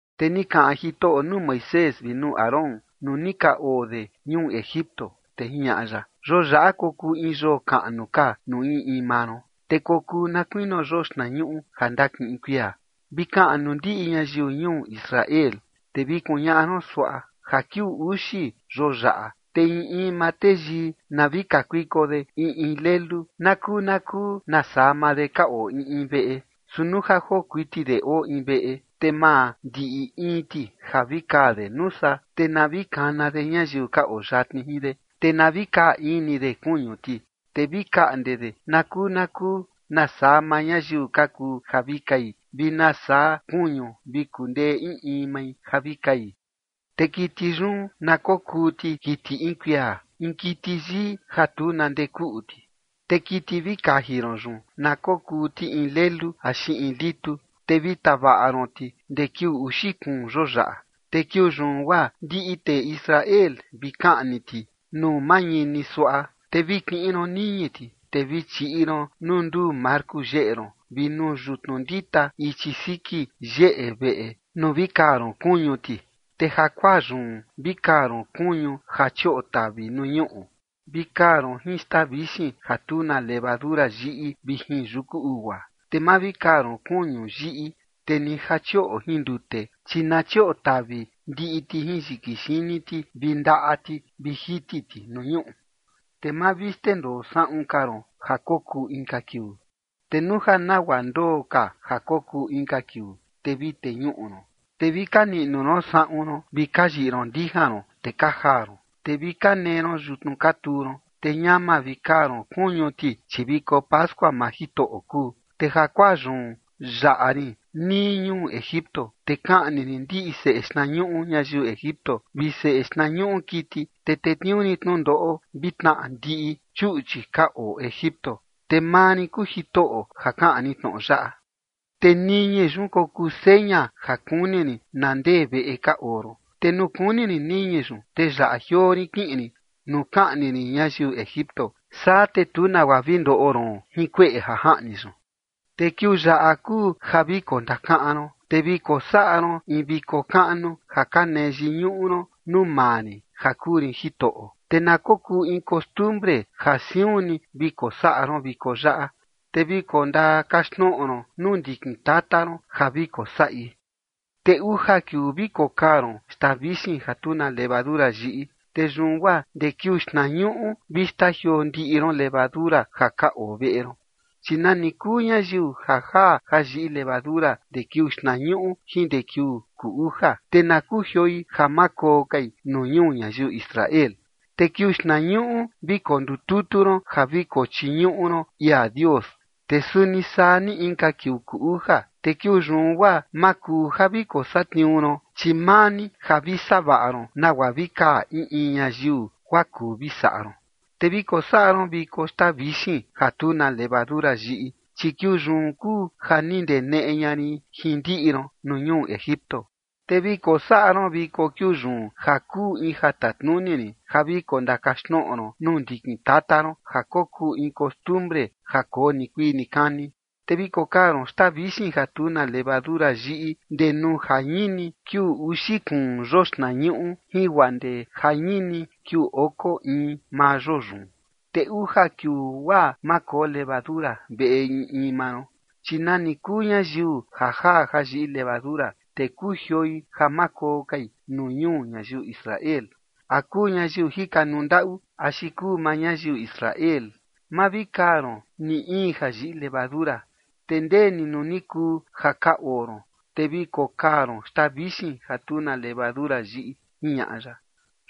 Te ni kaꞌan Jitoꞌo nuu Moisés vi nuu Aarón nuu ni ka oo de ñuu Egipto, te jiñaꞌa ya: ―Yoo yaꞌa kokuu in yoo kaꞌnu ka nuu in in maa ron, te kokuu na kuinio yoo xtnañuꞌu ja ndakiꞌin kuia. Vi kaꞌan nuu ndiꞌi ñayiu ñuu Israel, te vi kuñaꞌa ron suaꞌa: “Ja kiuu uxi yoo yaꞌa, te in in maa teyii na vi kakuiko de in in lelu nakuu nakuu nasaa maa de ka oo in in veꞌe. Su nuu ja joo kuiti de oo in veꞌe, te ma ndiꞌi in ti ja vi kaa de nuu saa, te na vi kana de ñayiu ka oo yatni jin de, te na vi kaa in ni de kuñu ti, te vi kaꞌnde de nakuu nakuu nasaa maa ñayiu ka kuu ja vi kai vi nasaa kuñu vi kundee in in mai ja vi kai. Te kiti yun na kokuu ti kiti in kuia, in kiti yii ja tu na ndee kuꞌu ti, te kiti vi kaji ron yun na kokuu ti in lelu axi in litu. Te vi tavaꞌa ron ti ndee kiuu uxi kuun yoo yaꞌa, te kiuu yun guaa ndiꞌi tee Israel vi kaꞌni ti nuu mañini suaꞌa. Te vi kiꞌin ron niñi ti, te vi chiꞌi ron nuu nduu marku yeꞌe ron vi nuu yutnu ndita ichi siki yeꞌe veꞌe nuu vi kaa ron kuñu ti. Te jakuaa yun vi kaa ron kuñu ja chioꞌo tavi nuu ñuꞌu, vi kaa ron jin xtaa vixin ja tu na levadura yiꞌi vi jin yuku ugua. Te ma vi kaa ron kuñu yiꞌi, te ni ja chioꞌo jin ndute, chi na chioꞌo tavi ndiꞌi ti jin yiki xini ti vi ndaꞌa ti vi jiti ti nuu ñuꞌu. Te ma vi xndendoo saꞌun ka ron ja kokuu inka kiuu. Te nuu ja nagua ndoo ka ja kokuu inka kiuu, te vi teñuꞌu ron. Te vi ka niꞌnu ron saꞌun ron vi ka yiꞌi ron ndijan ron, te ka jaa ron, te vi ka nee ron yutnu ka tuu ron, te ñama vi kaa ron kuñu ti, chi viko pascua maa Jitoꞌo kuu. Te jakuaa yun yaꞌa rin nii ñuu Egipto, te kaꞌni rin ndiꞌi seꞌe xtnañuꞌu ñayiu Egipto vi seꞌe xtnañuꞌu kiti, te tetniuu rin tnundoꞌo vi tnaꞌa ndiꞌi chuꞌchi ka oo Egipto. Te maa rin kuu Jitoꞌo ja kaꞌan rin tnoꞌo yaꞌa. ’Te niñi yun kokuu seña ja kuni rin na ndee veꞌe ka oo ron, te nuu kuni rin niñi yun, te yaꞌa jioo rin kiꞌin rin nuu kaꞌni rin ñayiu Egipto. Saa te tu nagua vi ndoꞌo ron jin kueꞌe ja jaꞌni yun. Te kiuu yaꞌa kuu ja vi kondakaꞌan ron, te vi kosaꞌa ron in viko kaꞌnu ja ka nee yiñuꞌu ron nuu maa rin ja kuu rin Jitoꞌo. Te na kokuu in costumbre ja siun ni vi kosaꞌa ron viko yaꞌa, te vi kondakaxtnoꞌo ron nuu ndikin tata ron ja vi kosaꞌi. Te uja kiuu vi kokaa ron xtaa vixin ja tu na levadura yiꞌi. Te yun guaa ndee kiuu xtnañuꞌu vi xtajioo ndiꞌi ron levadura ja ka oo veꞌe ron, chi nani kuu ñayiu ja jaa ja yiꞌi levadura ndee kiuu xtnañuꞌu jin ndee kiuu kuu uja, te na kujioi ja ma koo kai nuu ñuu ñayiu Israel. Te kiuu xtnañuꞌu vi kondututu ron ja vi kochiñuꞌu ron ia Dios. Te suni saa ni inka kiuu kuu uja. Te kiuu yun guaa ma kuu ja vi kosatniuu ron, chi maa ni ja vi savaꞌa ron nagua vi kaa in in ñayiu guaa kuu vi saꞌa ron. Te vi kosaꞌa ron viko xtaa vixin ja tu na levadura yiꞌi, chi kiuu yun kuu ja ni ndeneꞌe ña rin jin ndiꞌi ron nuu ñuu Egipto. Te vi kosaꞌa ron viko kiuu yun ja kuu in ja tatnuni rin ja vi kondakaxtnoꞌo ron nuu ndikin tata ron ja kokuu in costumbre ja koo nikuii nikani. Te vi kokaa ron xtaa vixin ja tu na levadura yiꞌi ndee nuu jañini kiuu uxi kuun yoo xtnañuꞌu jin guaa ndee jañini kiuu oko in maa yoo yun. Te uja kiuu guaa ma koo levadura veꞌe in in maa ron, chi nani kuu ñayiu ja jaa ja yiꞌi levadura, te kujioi ja ma koo kai nuu ñuu ñayiu Israel, a kuu ñayiu jikanuu ndaꞌu axi kuu maa ñayiu Israel. Ma vi kaa ron ni in ja yiꞌi levadura. Te ndee ni nuu ni kuu ja ka oo ron, te vi kokaa ron xtaa vixin ja tu na levadura yiꞌi” ―jiñaꞌa ya.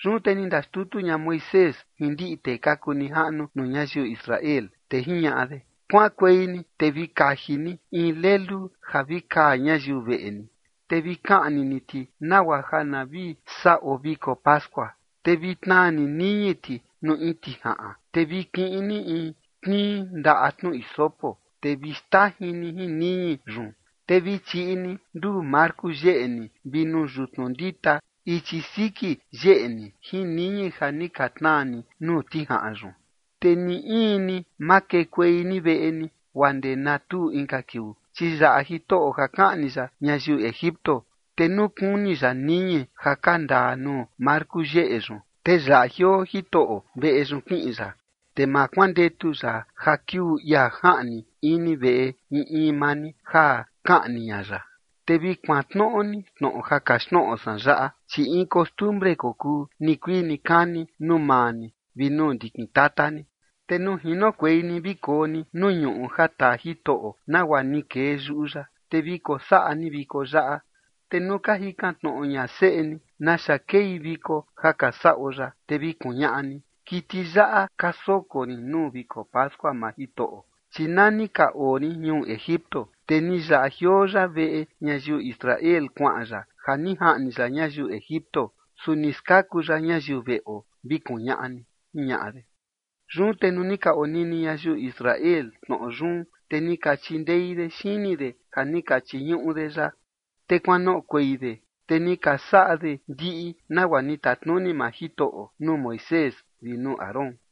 Yun te ni ndaxtutu ña Moisés jin ndiꞌi tee ka kuu nijaꞌnu nuu ñayiu Israel, te jiñaꞌa de: ―Kuaꞌankuei ni te vi kaji ni in lelu ja vi kaa ñayiu veꞌe ni, te vi kaꞌni ni ti nagua ja na vi saꞌo viko pascua. Te vi tnaa ni niñi ti nuu in tijaꞌan, te vi kiꞌin ni in tnii ndaꞌa tnu hisopo, te vi xtajin ni jin niñi yun. Te vi chiꞌi ni nduu marku yeꞌe ni vi nuu yutnu ndita ichi siki yeꞌe ni jin niñi ja ni ka tnaa ni nuu tijaꞌan yun. Te ni in ni ma kekuei ni veꞌe ni guaa ndee na tuu inka kiuu. Chi yaꞌa Jitoꞌo ja kaꞌni ya ñayiu Egipto, te nuu kuni ya niñi ja ka ndaa nuu marku yeꞌe yun, te yaꞌa jioo Jitoꞌo veꞌe yun kiꞌin ya. Te ma kuandetu ya ja kiuu ia jaꞌni ini veꞌe in in maa ni ja kaꞌni ña ya. Te vi kuantnoꞌo ni tnoꞌo ja kaxtnoꞌo san yaꞌa, chi in costumbre kokuu nikuii nikani nuu maa ni vi nuu ndikin tata ni. Te nuu jinokuei ni vi koo ni nuu ñuꞌu ja taa Jitoꞌo nagua ni kee yuꞌu ya, te vi kosaꞌa ni viko yaꞌa. Te nuu ka jikan tnoꞌo ña seꞌe ni: “¿Naxa kei viko ja ka saꞌo yaꞌa?”, te vi kuñaꞌa ni: “Kiti yaꞌa ka soko rin nuu viko pascua maa Jitoꞌo, chi nani ka oo rin ñuu Egipto, te ni yaꞌa jioo ya veꞌe ñayiu Israel kuaꞌan ya ja ni jaꞌni ya ñayiu Egipto. Su ni skaku ya ñayiu veꞌo”, vi kuñaꞌa ni ―jiñaꞌa de. Yun te nuu ni ka onini ñayiu Israel tnoꞌo yun, te ni ka chindei de xini de ja ni ka chiñuꞌu de ya. Te kuanoꞌokuei de, te ni ka saꞌa de ndiꞌi nagua ni tatnuni maa Jitoꞌo nuu Moisés vi nuu Aarón.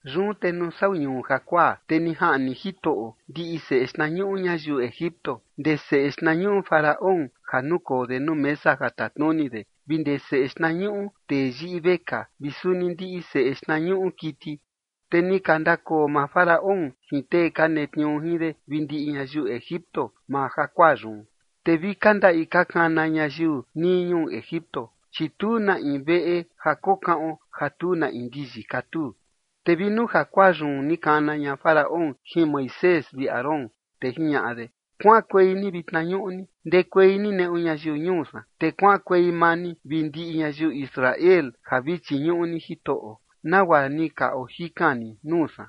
Yun te nuu sau ñuu jakuaa, te ni jaꞌni Jitoꞌo ndiꞌi seꞌe xtnañuꞌu ñayiu Egipto, ndee seꞌe xtnañuꞌu Faraón ja nukoo de nuu mesa ja tatnuni de vi ndee seꞌe xtnañuꞌu tee yiꞌi vekaa vi suni ndiꞌi seꞌe xtnañuꞌu kiti. Te ni ka ndakoo maa Faraón jin tee ka netniuu jin de vi ndiꞌi ñayiu Egipto maa jakuaa yun, te vi ka ndaꞌi ka kana ñayiu nii ñuu Egipto, chi tu na in veꞌe ja kokaꞌon ja tu na in ndiyi katuu. Te vi nuu jakuaa yun ni kana ña Faraón jin Moisés vi Aarón, te jiñaꞌa de: ―Kuaꞌankuei ni vitna ñuꞌni ndekuei ni neꞌu ñayiu ñuu san, te kuaꞌankuei maa ni vi ndiꞌi ñayiu Israel ja vi chiñuꞌu ni Jitoꞌo, nagua ni ka ojikan ni nuu san.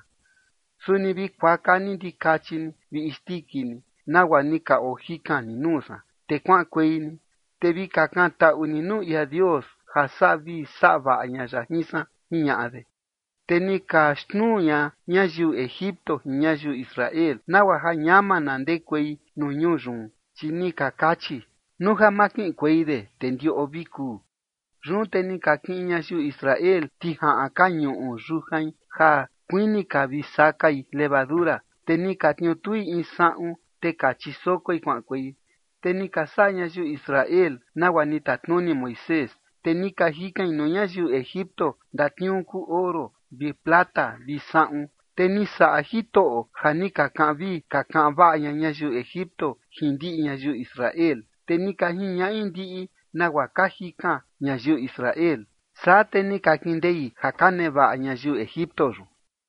Suni vi kuaka ni ndikachi ni vi isndiki ni, nagua ni ka ojikan ni nuu san, te kuaꞌankuei ni. Te vi kakantaꞌu ni nuu ia Dios ja saꞌa vii saꞌa vaꞌa ña ya jin san ―jiñaꞌa de. Te ni ka xnuu ña ñayiu Egipto jin ñayiu Israel, nagua ja ñama na ndekuei nuu ñuu yun, chi ni ka kachi: ―Nuu ja ma kiꞌinkuei de te ndiꞌo vi kuu. Yun te ni ka kiꞌin ñayiu Israel tijaꞌan ka ñuꞌu yujain ja kuini ka vi sakai levadura, te ni ka tniutui in saꞌun, te ka chisokoi kuaꞌankuei. Te ni ka saꞌa ñayiu Israel nagua ni tatnuni Moisés, te ni ka jikain nuu ñayiu Egipto ndatniuu kuu oro vi plata vi saꞌun. Te ni saꞌa Jitoꞌo ja ni ka kaꞌan vii ka kaꞌan vaꞌa ña ñayiu Egipto jin ndiꞌi ñayiu Israel, te ni ka jiñaꞌi ndiꞌi nagua ka jikan ñayiu Israel. Saa te ni ka kindei ja ka nevaꞌa ñayiu Egipto yun.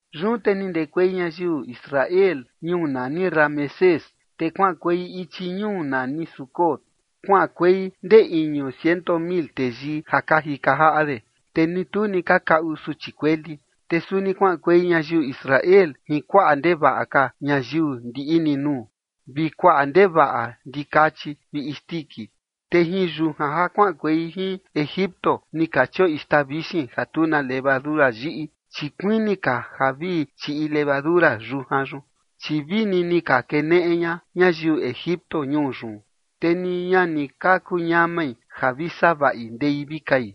Yun te ni ndekuei ñayiu Israel ñuu nani Ramesés, te kuaꞌankuei ichi ñuu nani Sucot. Kuaꞌankuei ndee iñu ciento mil teyii ja ka jika jaꞌa de, te ni tu ni ka kaꞌu suchi kueli. Te suni kuaꞌankuei ñayiu Israel jin kuaꞌa ndevaꞌa ka ñayiu ndiꞌi ni nuu, vi kuaꞌa ndevaꞌa ndikachi vi isndiki. Te jin yujan ja kuaꞌankuei jin Egipto ni ka chioꞌi xtaa vixin ja tu na levadura yiꞌi, chi kuini ka ja vi chiꞌi levadura yujan yun, chi vini ni ka keneꞌe ña ñayiu Egipto ñuu yun, te ni ña ni ka kuñamai ja vi savaꞌi ndei vi kai.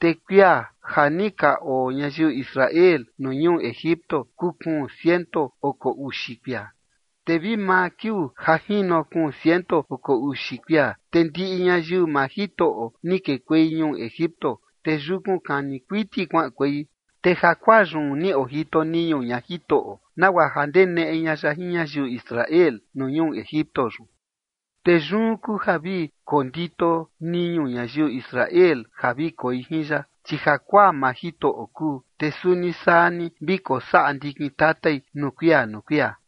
Te kuia ja ni ka oo ñayiu Israel nuu ñuu Egipto kuu kuun ciento oko uxi kuia. Te vi maa kiuu ja jino kuun ciento oko uxi kuia, te ndiꞌi ñayiu maa Jitoꞌo ni kekuei ñuu Egipto, te yukun kani kuiti kuaꞌankuei. Te jakuaa yun ni ojito niñu ña Jitoꞌo nagua ja ndeneꞌe ña ya jin ñayiu Israel nuu ñuu Egipto yun. Te yun kuu ja vi kondito niñu ñayiu Israel ja vi koi jin ya, chi jakuaa maa Jitoꞌo kuu, te suni saa ni vi kosaꞌa ndikin tatai nuu kuia nuu kuia.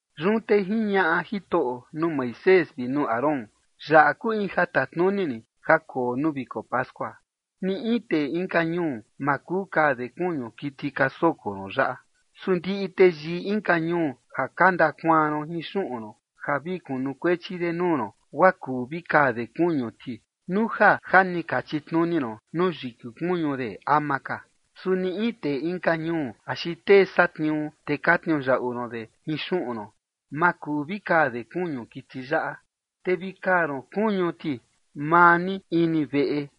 Yun te jiñaꞌa Jitoꞌo nuu Moisés vi nuu Aarón: ―Yaꞌa kuu in ja tatnuni rin ja koo nuu viko pascua. Ni in tee inka ñuu ma kuu kaa de kuñu kiti ka soko ron yaꞌa. Su ndiꞌi teyii inka ñuu ja ka ndakuaan ron jin xuꞌun ron ja vi kunukuechi de nuu ron, guaa kuu vi kaa de kuñu ti nuu ja ja ni ka chitnuni ron nuu yiki kuñu de ama ka. Su ni in tee inka ñuu axi tee satniuu, te ka tniuyaꞌu ron de jin xuꞌun ron, ma kuu vi kaa de kuñu kiti yaꞌa. Te vi kaa ron kuñu ti maa ni ini veꞌe,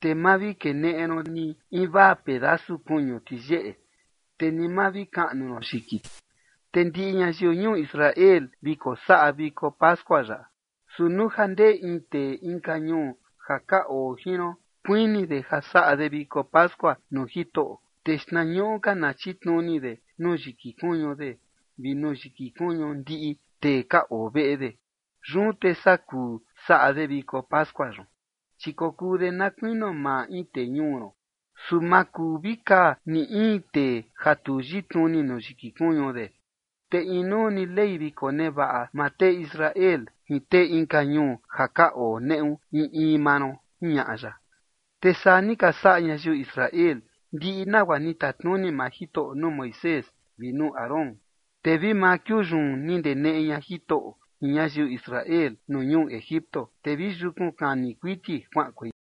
te ma vi keneꞌe ron ni invaa pedasu kuñu ti yeꞌe, te ni ma vi kaꞌnu ron yiki ti. Te ndiꞌi ñayiu ñuu Israel vi kosaꞌa viko pascua yaꞌa. Su nuu ja ndee in tee inka ñuu ja ka oo jin ron kuini de ja saꞌa de viko pascua nuu Jitoꞌo, te xtnañuꞌu ka na chitnuni de nuu yiki kuñu de vi nuu yiki kuñu ndiꞌi tee ka oo veꞌe de. Yun te saa kuu saꞌa de viko pascua yun, chi kokuu de na kuinio maa in tee ñuu ron. Su ma kuu vi kaa ni in tee ja tu yitnuni nuu yiki kuñu de. Te inuu ni ley vi konevaꞌa maa tee Israel jin tee inka ñuu ja ka oo neꞌu in in maa ron ―jiñaꞌa ya. Te saa ni ka saꞌa ñayiu Israel, ndiꞌi nagua ni tatnuni maa Jitoꞌo nuu Moisés vi nuu Aarón. Te vi maa kiuu yun ni ndeneꞌe ña Jitoꞌo jin ñayiu Israel nuu ñuu Egipto, te vi yukun kani kuiti kuaꞌankuei.